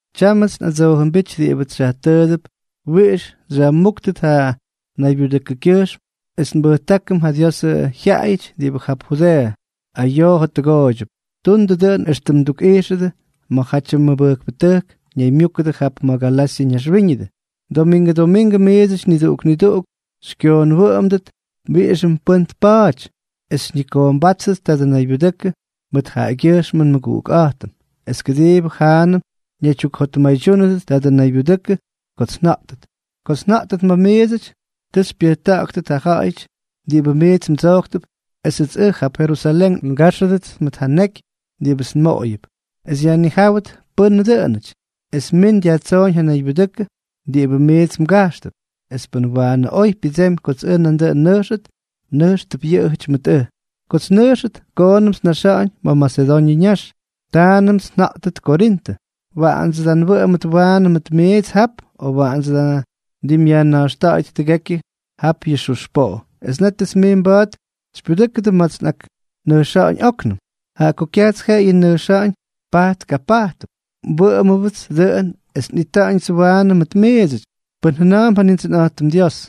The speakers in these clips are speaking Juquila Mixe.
Tyámʉts nꞌadsoojʉmbíty diꞌibʉts xyajtʉʉdʉp wiꞌix xyajmúktʉt ja naybyudʉkʉkyʉjxm es nbutʉjkʉm ja Diosʉ jyaꞌayʉty diꞌibʉ jap Judeeʉ ayoo jottʉgooydyʉp. Tundʉ dʉꞌʉn éxtʉm ndukniꞌijxʉdʉ ma̱jatyʉ mʉbʉjkpʉtʉjk ñaymyúkʉdʉ jap ma̱ Galasyʉ ñaxwíñʉdʉ. Domingʉ domingʉ miidsʉty niduꞌuk niduꞌuk xykyoonwʉꞌʉmdʉt wiꞌixʉm pʉ́n tpa̱a̱ty, es xyñikoombátʉt tadʉ naybyudʉkʉ mʉt jaꞌagyʉjxmʉ nmʉguꞌukꞌa̱jtʉm, es kʉdiibʉ jaanʉm mnaydyukjotmaydyúnʉdʉt tadʉ naybyudʉkʉ kots nja̱ꞌtʉt. Kots nja̱ꞌtʉt ma̱ miidsʉty, ta xypyʉjta̱ꞌa̱ktʉt ja ja̱ꞌa̱y diꞌibʉ miits mdsojktʉp esʉts ʉj jap Jerusalén ngáxʉdʉts mʉt ja neky diꞌibʉts nmoꞌoyʉp, es yajnijáwʉt pʉ́nʉ dʉꞌʉnʉty, es min dyajtsooñ ja naybyudʉkʉ diꞌibʉ miits mgajxtʉp. Es pʉn waanʉ oy pyʉdsemy kots ʉj nandʉꞌʉn nnʉjxʉt, nʉjxtʉp yʉꞌʉjʉty mʉt ʉj. Kots nnʉjxʉt, koonʉmts nnaxa̱ꞌa̱ñ ma̱ Masedoñʉ ñax, taanʉmts nja̱ꞌtʉt Korintʉ. Waꞌandsʉ da nwʉꞌʉmʉt waanʉ mʉt miits jap, o waꞌandsʉ da ndimꞌyajna̱jxta̱ꞌa̱yʉt tʉgekyʉ jap yʉ xux poꞌo; es nétʉts miits mba̱a̱t xypyudʉ́kʉdʉ ma̱ts nꞌaknʉjxa̱ꞌa̱ñ óknʉm. Jaꞌa ko kyajts jeꞌeyʉ nnʉjxa̱ꞌa̱ñ pajt kapajtp, wʉꞌʉma̱a̱mbʉdsʉ dʉꞌʉn es nꞌita̱ꞌa̱ñ waanʉ mʉt miidsʉty, pʉn jʉna̱a̱mp ja Nindsʉnꞌa̱jtʉm Dios.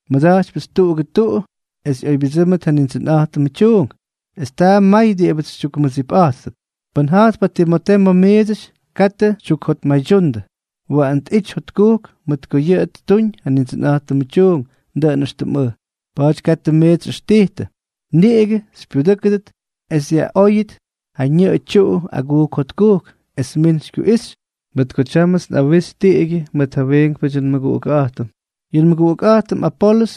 mʉt ko nmʉda̱jtypyʉts tuꞌugʉ tuꞌu es ꞌyoybyʉdsʉ́mʉt ja Nindsʉnꞌa̱jtʉmʉ tyuunk, es taa may diꞌibʉts xytyukmʉdsipꞌa̱jttʉp. Pʉn ja̱jtp ja Timotee ma̱ miidsʉty, katʉ ti xytyuktukjotmaydyundʉ. Waꞌan tꞌity jotkujk, mʉt ko yʉꞌʉ ttuñ ja Nindsʉnꞌa̱jtʉmʉ tyuunk, dʉꞌʉn éxtʉm ʉj. Pa̱a̱ty katʉ miits xyꞌʉxtijtʉ; niꞌigʉ xypyudʉ́kʉdʉt es dyajꞌyoꞌoyʉt ja ñʉꞌʉ tyuꞌu agujk jotkujk, esʉts min xykyuꞌixy, mʉt ko tyámʉts nꞌawixy tiꞌigyʉ mʉt ja wiinkpʉdyʉ nmʉguꞌukꞌa̱jtʉm. Yʉ nmʉguꞌukꞌa̱jtʉm Apolʉs,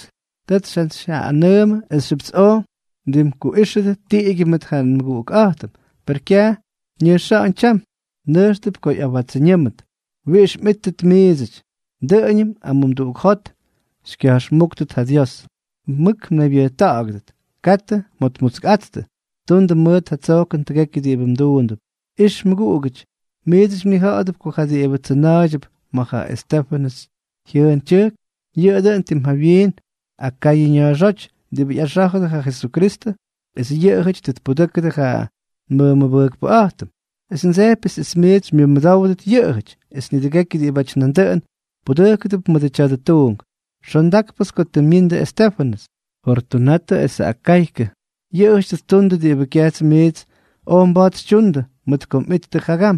tʉts njantsyjyaꞌꞌanʉʉmʉ esxyʉp oj mdimkuꞌíxʉdʉ tiꞌigyʉ mʉt ja nmʉguꞌukꞌa̱jtʉm, per kyaj ñʉjxáñ tyam. Nʉjxʉp ko ja tiempʉ ꞌyawátsʉñʉmʉt. Wijy mꞌíttʉt miidsʉty. Dʉꞌʉñʉm amumduꞌuk jot xyꞌakmʉbʉ́ktʉt ja Dios. Mʉk mnaybyʉjta̱ꞌa̱gʉdʉt. Katʉ mjotmutskꞌattʉ. Tundʉ mʉt ja tsojkʉn tʉgekyʉ diꞌibʉ mduundʉp. Ix, mʉguꞌugítʉty, miits mnija̱ꞌa̱dʉp ko ja diꞌibʉ tsʉna̱a̱ydyʉp ma̱ ja Estéfʉnʉs jyʉʉn tyʉjk, yʉꞌʉ dʉn tim jawyiin Akayʉ ña̱a̱xóty diꞌibʉ ꞌyaxá̱jʉdʉ ja Jesukristʉ, es yʉꞌʉjʉty tʉ tpudʉ́kʉdʉ ja nmʉmʉbʉjkpʉꞌa̱jtʉm. Es ndsejpyʉts es miits xymyʉmʉdówdʉt yʉꞌʉjʉty, es nidʉgekyʉ diꞌibáty nandʉꞌʉn pudʉjkʉdʉp mʉdʉ tya̱dʉ tuunk. Xondákpʉts ko tʉ myindʉ Estéfʉnʉs, Fortunatʉ esʉ Akaykʉ. Yʉꞌʉjʉty tʉ ttundʉ diꞌibʉ kyaj miits oj mba̱a̱t xytyundʉ mʉt ko mꞌittʉ jagam,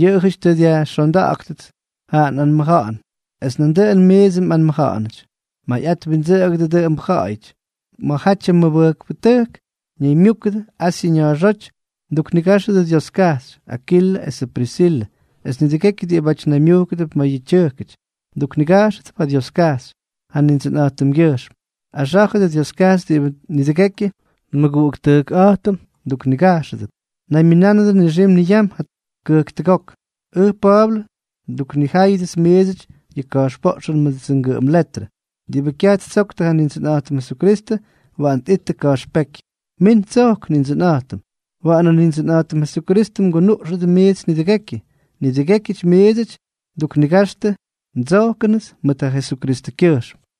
yʉꞌʉjʉty tʉ dyajxonda̱ꞌa̱ktʉts ja nꞌanmʉja̱ꞌa̱n, es nandʉꞌʉn miidsʉ mꞌanmʉja̱ꞌa̱nʉty. Mayꞌat windsʉꞌʉgʉdʉ dʉꞌʉmbʉ ja̱ꞌa̱yʉty. Ma̱jatyʉ mʉbʉjkpʉtʉjk ñaymyúkʉdʉ Asyʉ ña̱a̱xóty mduknigáxʉdʉ Dioskajxy. Akilʉ esʉ Prisilʉ, es nidʉgekyʉ diꞌibáty naymyujkʉdʉp ma̱ yʉꞌʉ tyʉjkʉty, mduknigajxʉdʉp ja Dioskajxy ja Nindsʉnꞌa̱jtʉmgyʉjxm. Axá̱jʉdʉ Dioskajxy diꞌibʉ nidʉgekyʉ nmʉguꞌuktʉjkꞌa̱jtʉm mduknigajxʉdʉp. Naymyʉnánʉdʉ nixim niyam kʉjktʉgok. Ʉj Pa̱a̱blʉ, nduknijáyʉdʉts miidsʉty yʉ ka̱jxpoꞌxʉn mʉdʉdsʉ ngʉꞌʉm letrʉ. Diꞌibʉ kyaj ttsoktʉ Nindsʉnꞌa̱jtʉm Jesukristʉ, waꞌan tꞌitʉ ka̱jxpéky. ¡Min tsojk, Nindsʉnꞌa̱jtʉm! Waꞌanʉ Nindsʉnꞌa̱jtʉm Jesukristʉ mgunuꞌxʉdʉ miits nidʉgekyʉ. Nidʉgékyʉty miits nduknigaxtʉ ndsojkʉnʉts mʉt ja Jesukristʉkyʉjxm.